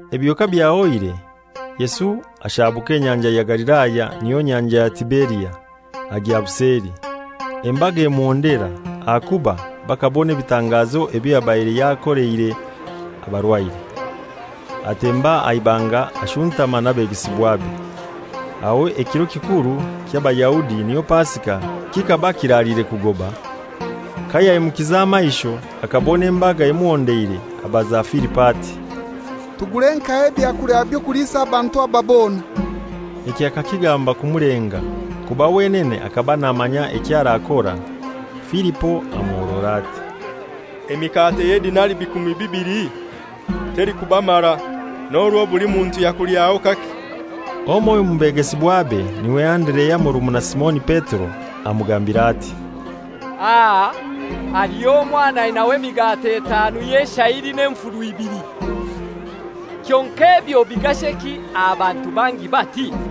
Ebyo kabyahoire, Yesu ashabuka Enyanja ya Galilaya, niyo Nyanja ya Tiberia, agya buseli. Embaga emuhondera, ahakuba bakabona ebitangazo ebyo yabaire yakoleire abarwaire. Atemba aha ibanga ashuntama n'abegesibwabe. Aho ekiro kikuru ky'Abayahudi, niyo Pasika, kikaba kiraliire kugoba. Kayaimukize amaisho akabona embaga emuhondeire, abaza Filipo ati, «Tugure nkahai ebyakulya eby'okuliisa abantu aba bona?» Ekyo akakigamba kumulenga, kuba wenene hakaba namanya eky'arakora. Filipo amuhorora ati, «Emikate y'edinairi bikumi bibili telikubamara, n'orwo buli muntu yakulyaho kake.» Omoiho omu begesibwabe, n'iwe Anderea murumuna Simoni Petero, amugambira ati, «Aha haliho omwana ainaho emikate etanu y'eshayiri n'enfuru ibili. Kyonkai ebyo bigasheki aha bantu bangi bati?»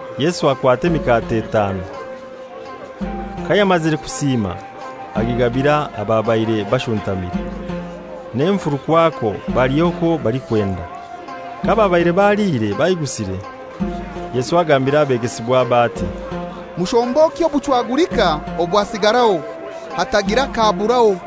Yesu akwata emikate etanu. Kayamazire kusiima agigabira ababaire bashuntamire. N'enfuru kwakwo balya okwo balikwenda. Kababaire baliire baigusire, Yesu agambira ebegesibwabe ati, «Mushombokye obuchwagulika obwasigaraho, hatagira kaburaho.»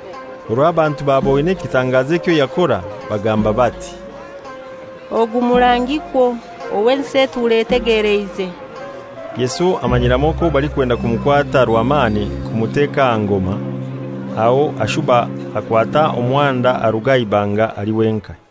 Orwo abantu baboine ekitangazo ekyo yakora, bagamba bati, «Ogu murangikwo owo ensi etura etegeleize!» Yesu amanyiramu okwo balikwenda kumukwata rwamani kumuteka aha ngoma, aho ashuba akwata omuhanda aruga aha ibanga ali wenkai.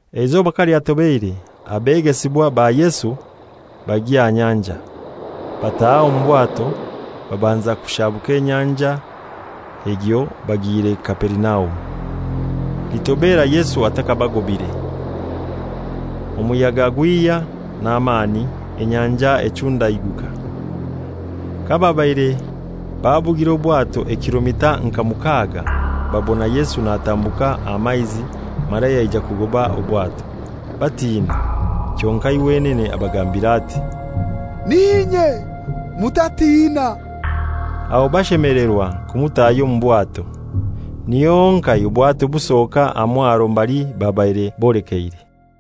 Eizoba kalyatobeire, abegesibwa ba Yesu bagya aha nyanja, bataha omu bwato, babanza kushabuka enyanja egyo bagiire Kaperinaumu. Litobera Yesu athakabagobire. Omuyaga gwihya n'amani, enyanja echundaiguka. Kababaire babugire obwato emaili nka inai babona Yesu natambuka aha maizi mara yaija kugoba obwato. Batina, kyonkai wenene abagambira ati, «N'inye, mutatina.» Aho bashemelerwa kumutahya omu bwato, niho honkai obwato busoka aha mwaro mbali babaire bolekeire.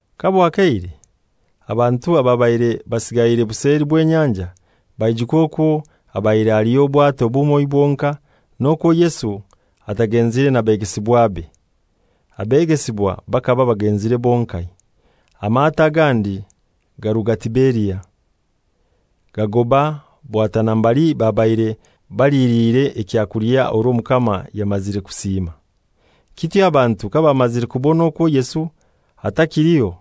Kabwakeire, abantu ababaire basigaire buseli bw'enyanja, baijuka okwo habaire haliho obwato bumoi bwonkai, n'okwo Yesu atagenzire na begesibwabe; abegesibwa bakaba bagenzire bonkai. Amato agandi garuga Tiberia, gagoba bwatana mbali babaire baliliire ekyakulya orwo Omukama yamazire kusiima. Kityo abantu kabamazire kubona okwo Yesu atakiliho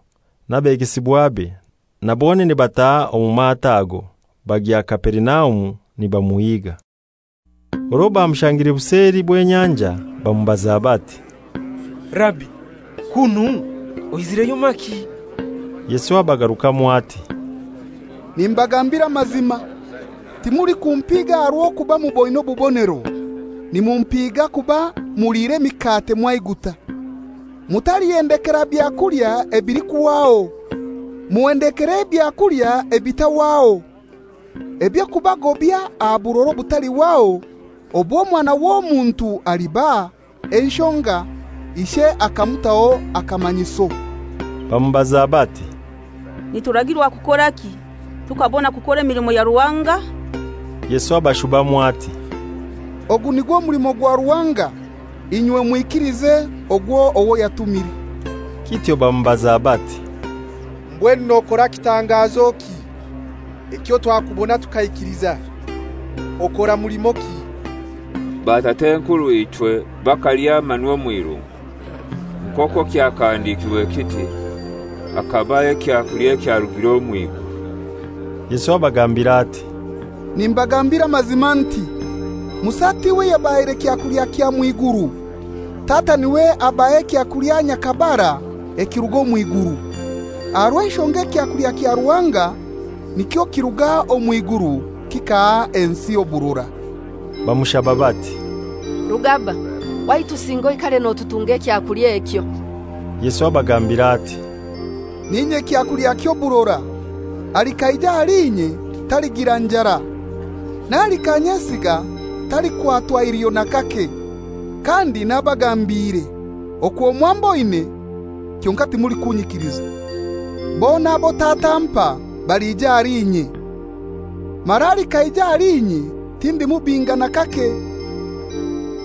n'abegesibwabe, na bonene bataha omu mato ago, bagya Kaperinaumu nibamuhiga. Orwo bamushangire buseli bw'enyanja bamubaza bati, «Rabi, kunu oizireyo maki?» Yesu abagarukamu ati, «Nimbagambira amazima, timulikumpiiga aha rw'okuba muboine bubonero, nimupiga kuba muliire emikate mwaiguta. Mutalihendekera byakulya ebilikuhwaho, muhendekere ebyakulya ebitahwaho eby'okubagobya aha burora obutalihwaho obw'Omwana w'Omuntu alibaha; enshonga ishe akamutaho akamanyiso.» Bamubaza bati, «Nituragirwa kukoraki, tukabona kukora emilimo ya Ruhanga?» Yesu abashubamu ati, «Ogu nigwo mulimo gwa Ruhanga, inywe mwikilize ogwo owo yatumire.» Kityo bamubaza bati, «Mbwenu nokora kitangazoki ekyo twakubona tukaikiliza? Okora mulimoki? Batat'enkurw'ichwe bakalya manu omw'irungu; nk'okwo kyakahandikirwe kiti, ‹Hakabaha ekyakulya ekyarugire omw'iguru.›» Yesu abagambira ati, «Nimbagambira amazima nti, Musa tiwe yabahaire kyakulya kya mw'iguru. Tata n'iwe abaha ekyakulya nyhakabara ekiruga omw'iguru. Aha rw'enshonga ekyakulya kya Ruhanga nikyo kiruga omw'iguru kikaha ensi oburora.» Bamushaba bati, «Rugaba, waitu singa oikare notutunga ekyakulya ekyo.» Yesu abagambira ati, «N'inye kyakulya ky'oburora. Alikaija ahali inye taligira njara; n'alikanyesiga talikwatwa iliho nakake. Kandi nabagambiire okwo mwamboine kyonkai timulikunyikiliza. Bona abo Tata ampa balija ahali inye; mara alikaija ahali inye tindimubinga n'akake.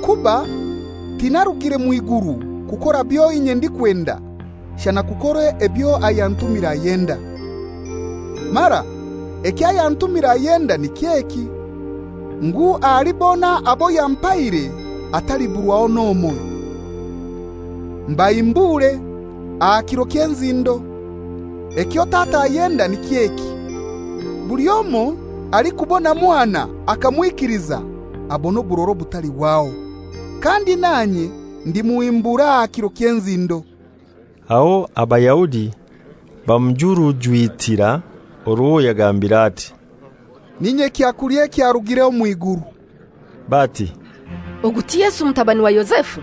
Kuba tinairugire mw'iguru kukora byo inye ndikwenda, shana kukora ebyo ayantumire ayenda. Mara eky'ayantumire ayenda niky'eki, ngu ahali bona abo yampaire hataliburwaho n'omoi, mbahimbure aha kiro ky'enzindo. Ekyo Tata ayenda niky'eki: Buli omoi alikubona Mwana akamwikiliza abone oburora obutalihwaho, kandi nanye ndimuhimbura aha kiro ky'enzindo.» Aho Abayahudi bamujurujwitira orwo yagambire ati, «N'inye kyakulya ekyarugire omw'iguru.» Bati, «Ogu ti Yesu mutabani wa Yozefu?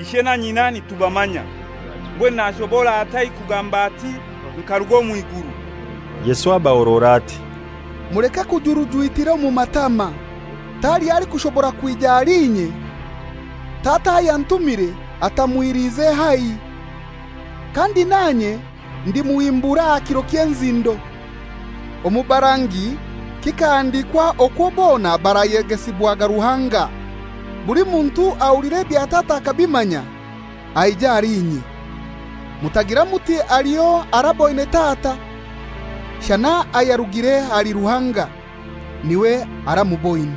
Ishe na nyina nitubamanya! Mbwenu nashobora atai kugamba ati, ‹Nkaruga omw'iguru?›» Yesu abahorora ati, «Muleke kujurujwitira omu matama. Taliho alikushobora kwija ahali inye, Tata ayantumire atamwiliize haihi. Kandi nanye ndimuhimbura aha kiro ky'enzindo. Omu barangi kikahandikwa okwo bona barayegesibwaga Ruhanga. Buli muntu ahulira ebya Tata akabimanya, aija ahali inye. Mutagira muti haliho araboine Tata, shana ayarugire ahali Ruhanga, n'iwe aramuboine.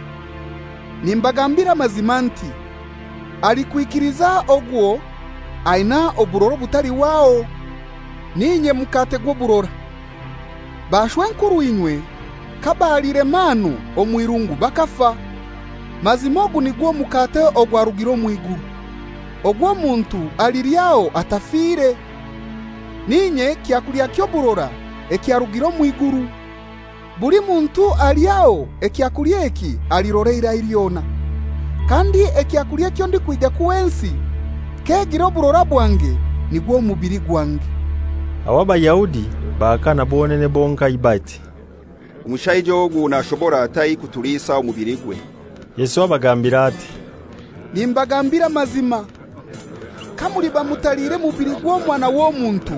Nimbagambira amazima nti, alikwikiliza ogwo aina oburora obutalihwaho. N'inye mukate gw'oburora. Bashwenkurw'inywe kabaliire manu omw'irungu bakafa. Mazima ogu nigwo mukate ogwarugire omw'iguru, ogwo omuntu alilyaho, atafire. N'inye kyakulya ky'oburora ekyarugire omw'iguru. Buli muntu alilyaho ekyakulya eki alirora eirai lyona. Kandi ekyakulya ekyo ndikwija kuha ensi k'egira oburora bwange nigwo mubili gwange.» Aho Abayahudi bahakana bonene bonkai bati, «Omushaija ogu nashobora atai kutuliisa omubiligwe?» Yesu abagambira ati, «Nimbagambira amazima, kamuliba mutaliire mubili gw'Omwana w'Omuntu,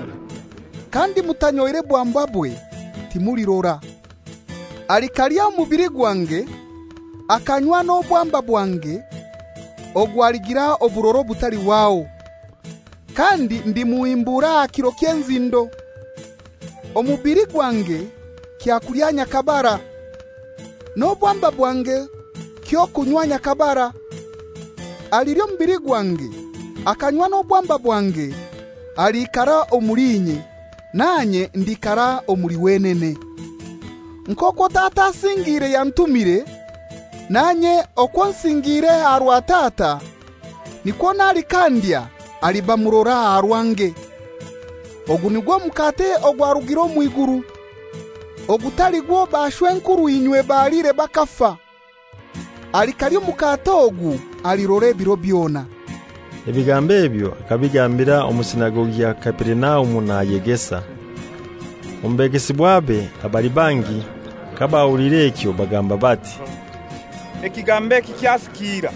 kandi mutanyoire bwambabwe, timulirora. Alikalya omubili gwange, akanywa n'obwamba bwange, ogwo aligira oburora obutalihwaho, kandi ndimuhimbura aha kiro ky'enzindo. Omubili gwange kyakulya nyhakabara, n'obwamba bwange ky'okunywa nyhakabara. Alilya omubili gwange akanywa n'obwamba bwange aliikara omuli inye, nanye ndiikara omuli wenene. Nk'okwo Tata asingiire yantumire, nanye okwo nsingiire aha rwa Tata, nikwo n'alikandya aliba murora aha rwange. Ogu nigwo mukate ogwarugire omw'iguru, ogutali gwo bashw'enkurw'inywe baliire bakafa; alikalya omukate ogu alirora ebiro byona.» Ebigambo ebyo akabigambira omu sinagogi ya Kaperinaumu nayegesa. Omu begesibwabe abali bangi kabahuliire ekyo bagamba bati, «Ekigambo eki kyasikiira,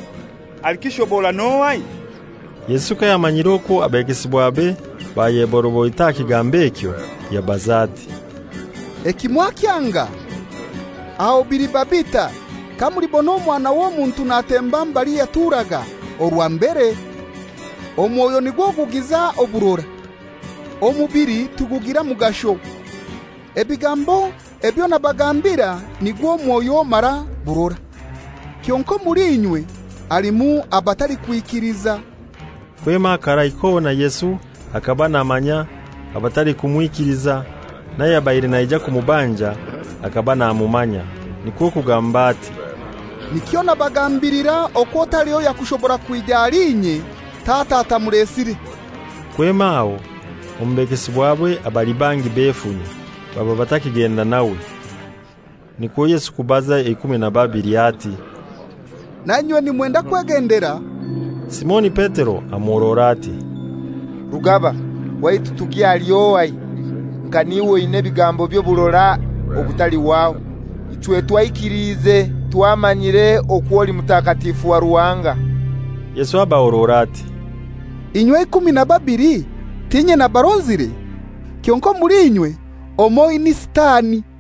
alikishobora n'ohai?» Yesu kayamanyire okwo abegesibwabe bayeboroboita aha kigambo ekyo, yabaza ati, «Eki mwakyanga? Aho biliba bitai kamulibona Omwana w'Omuntu natemba mbali yaturaga orwa mbere? Omwoyo nigwo gugiza oburora. Omubili tigugira mugasho. Ebigambo ebyo nabagambira nigwo mwoyo mara burora. Kyonkai omuli inywe halimu abatalikwikiliza.» Kwema akarai kona Yesu hakaba namanya abatalikumwikiliza n'ayabaire naija kumubanja hakaba namumanya. Nikwo kugamba ati, «Nikyo nabagambilira okwo taliho yakushobora kwija ahali inye Tata atamulesire.» Kwema aho omu begesibwabe abali bangi befunya, baba batakigenda nawe. Nikwo Yesu kubaza eikumi na babili ati, «Nainywe nimwenda kwegendera?» Simoni Petero amuhorora ati, «Rugaba, waitu tugye ahali ohai? Nka n'iwe oinai ebigambo by'oburora obutalihwaho! Ichwe twaikiliize, twamanyire okwo oli Mutakatifu wa Ruhanga.» Yesu abahorora ati, «Inywe eikumi na babili t'inye nabaronzire? Kyonkai omuli inywe omoi ni sitani.»